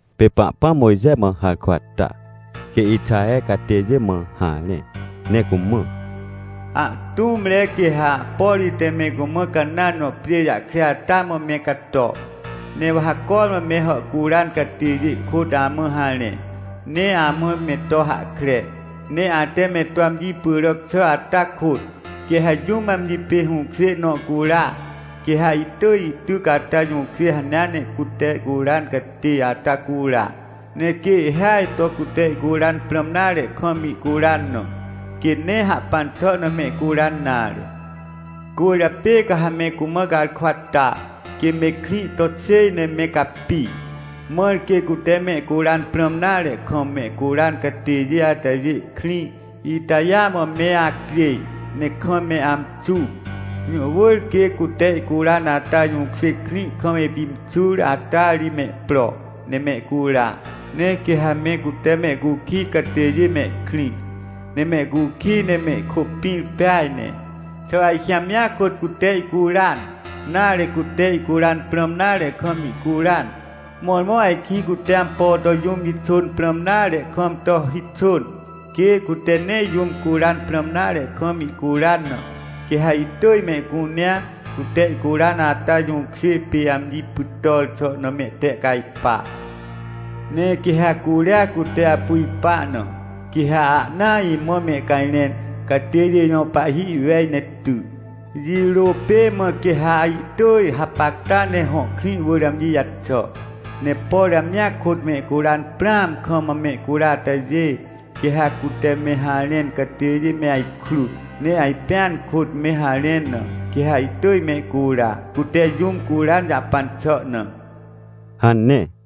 Pê Pahpãm Mojxe mã harkwa ta, quê Ixaher catêjê mã harẽ ne cumã: — Ahtũmre quê ha, por ite me cumã Canãn jõ pjê jahkre ata mã me cato. Ne wa ha cormã me hàhcuran catêjê kôt amã harẽ, ne amã me to hahkre. Ne ate me to amji pyràc xà ata kôt, quê ha jũm amji pê hũkjê nõ cura, quê ha ihtỳj ihtyc ata jũkjê hanea ne cute ihcuran catê ata cura. Ne quê ihhêaj to cute ihcuran prãm nare kam ihcuran na, quê nee hahpan xà na mehcuran nare. — Cwỳrjapê ca ha me cumã garkwa ta, quê me krĩ to xêj ne me capi, mãr quê cute mehcuran prãm nare kam mehcuran catêjê atajê krĩ itajêa mã me acjêj, ne kam me amxu. Jũ wỳr quê cute ihcuran ata jũkjê krĩ kam ipimxur ata ri me pro, ne mehcura. Ne quê ha me cute mehcukij catêjê mehkrĩ, ne mehcukij ne mehkôpĩr peaj ne, xà ajkĩ amjia kôt cute ihcuran, nare, cute ihcuran prãm nare kam ihcuran. Mõrmõ ajkĩ cute ampo to jũm jixôn prãm nare kam to hixôn. Quê cute nee jũm curan prãm nare kam ihcuran na, quê ha ihtỳj mehcunea, cute ihcuran ata jũkjê pê, amji pytàr xà na mehtehcajpa. — Ne quê ha curia cute apu ipa na, quê ha ahnaa imã mehcajrẽn catêjê jõ pahhi ihwej ne ty. Jirô pê mã quê ha ihtỳj hapacta ne hõ krĩ wỳr amji jaxà. Ne por amjia kôt mehcuran prãam kam mehcura atajê, quê ha cute me harẽn catêjê me ajkrut, ne ajpẽan kôt me harẽn na, quê ha ihtỳj mehcura, cute jũm curan jahpan xà na — hane.